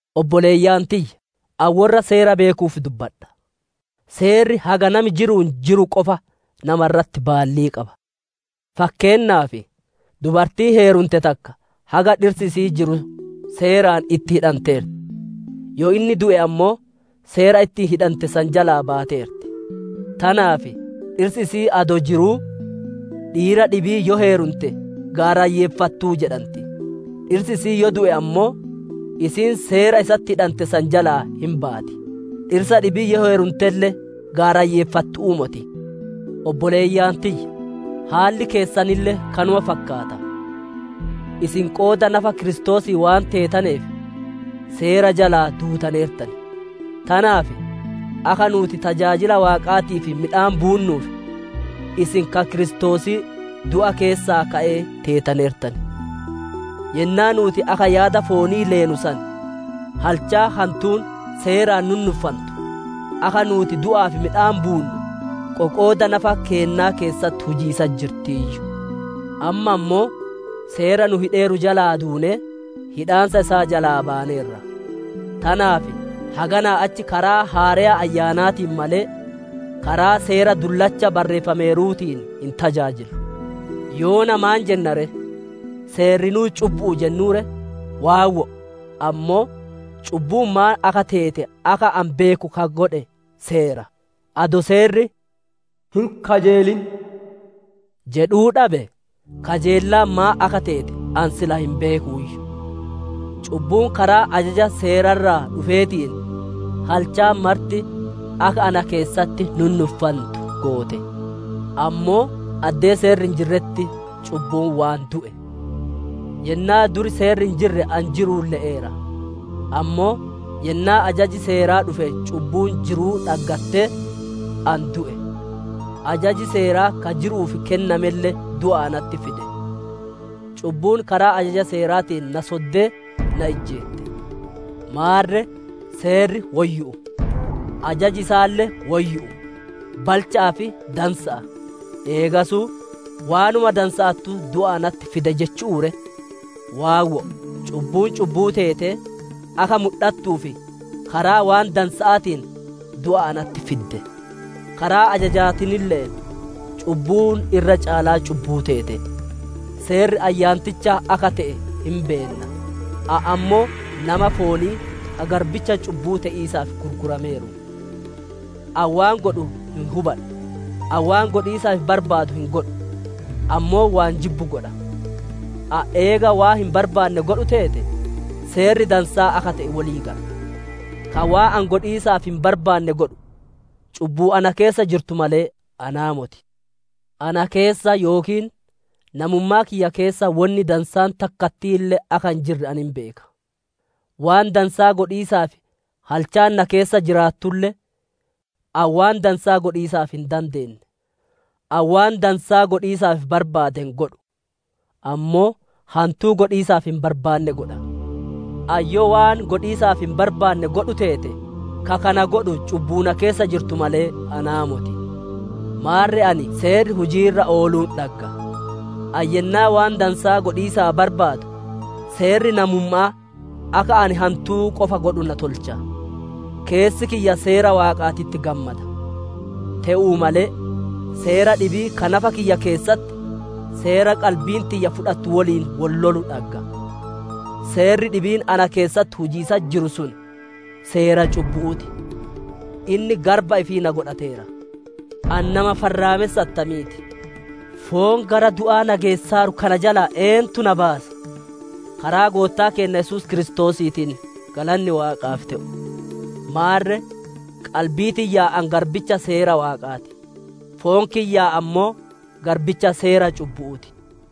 Obboleeyyan tiyya! Ani worra seera beekuuf dubbadha. Seerri haga nami jiru'uun jiru qofa nama irratti baallii qaba. Fakkeennaaf, dubartiin heerumte takka, haga dhirsi isi'ii jiru seeraan itti hidhanteerti; yoo inni du'e ammoo, seera ittiin hidhante san jalaa baateerti. Tanaaf dhirsi isi'ii adoo jiruu, dhiira dhibii yoo heerumte, gaarayyeeffattuu jedhanti. Dhirsi isi'ii yoo du'e ammoo, isiin seera isatti hidhante jalaa hin baati; dhirsa dhibii yoo heerumtelle gaarayyeeffattu'uu moti. Obboleeyyan tiyya! Haalli keessanille kanuma fakkaata; isin qooda nafa Kiristoosii waan teetaneef, Seera jalaa duutaneertan; tanaaf, akka nuuti tajaajila Waaqaatiif midhaan buunnuuf, isin ka Kiristoosii du'a keessaa ka'ee teetaneertan. Yennaa nuuti akka yaada foonii leenu san, halchaan hantuun Seeraan nunnuffantu, akka nuuti du'aaf midhaan buunnu, qoqooda nafa keennaa keessatti hujiisatti jirtiiyyu. Amma ammoo, Seera nu hidheeru jalaa duunee, hidhaansa isaa jalaa baaneerra. Tanaaf haganaa achi karaa haareya Ayyaanaatiin malee, karaa Seera dullacha barreeffameeruutiin hin tajaajillu. Yoona maan jenna ree? Seerrinuu cubbu'u jennuu ree? Waawwo'o! Ammoo cubbuun maan akka teete akka ani beeku ka godhe Seera. Adoo Seerri, «Hin kajeelin» jedhuu dhabe kajeellaan maan akka teete, ani sila hin beekuuyyu. Cubbuun karaa ajaja Seera irraa dhufeetiin, halchaan marti akka na keessatti nunnuffantu goote. Ammoo addee Seerri hin jirretti cubbuun waan du'e. Yennaa dur Seerri hin jirre ani jiru'uun le'eera; ammoo yennaa ajaji Seeraa dhufe cubbuun jiruu dhaggattee, ani du'e. Ajaji Seeraa ka jiru'uuf kennamelle du'a natti fide. Cubbuun karaa ajaja Seeraatiin na soddee, na ijjeette. Maarre, Seerri woyyu'u; ajaji isaalle woyyu'u, balcha'aa fi dansa'a. Eegasuu waanuma dansa'attuu du'a natti fide jechu'uu ree? Waawwo'o! Cubbuun cubbuu teetee akka mudhattuuf, karaa waan dansa'aatiin, du'a natti fidde. Karaa ajajaatiinille, cubbuun irra caalaa cubbuu teete. Seerri ayyaanticha akka te'e hin beenna. Ani ammoo nama foonii, ka garbicha cubbu'uu te'iisaaf gurgurameeru. Ani waan godhu hin hubadhu; ani waan godhiisaaf barbaadu hin godhu, ammoo waan jibbu godha. Ani eega waan hin barbaanne godhu teete, Seerri dansaa akka te'e wolii gala. Ka waan ani godhiisaaf hin barbaanne godhu, cubbuu na keessa jirtu malee anaa moti. Ana keessa yookiin namummaa kiyya keessa wonni dansaan takkattiille akka hin jirre ani hin beeka. Waan dansaa godhiisaaf halchaan na keessa jiraattulle, ani waan dansaa godhiisaaf hin dandeenne. Ani waan dansaa godhiisaaf barbaade hin godhu; ammoo hantuu godhiisaaf hin barbaanne godha. Ani yoo waan godhiisaaf hin barbaanne godhu teete, ka kana godhu cubbuu na keessa jirtu malee, anaa moti. Maarre ani Seerri hujii irra ooluun dhagga; ani yennaa waan dansaa godhiisaa barbaadu, seerri namumma'aa akka ani hantuu qofa godhu na tolcha. Keessi kiyya Seera Waaqaatitti gammada. Te'uu malee seera dhibii ka nafa kiyya keessatti, seera qalbiin tiyya fudhatu woliin wol lolu dhagga. Seerri dhibiin na keessatti hujiisatti jiru sun, seera cubbu'uu ti; inni garba ifii na godhateera. Ani nama farraamessa attamiiti! Foon gara du'aa na geessaaru kana jalaa eentu na baasa? Karaa Goottaa keenna Yesuus Kiristoosiitiin galanni Waaqaaf te'u! Maarre, qalbii tiyyaan ani garbicha Seera Waaqaa ti; foon kiyyaan ammoo garbicha seera cubbu'uu ti.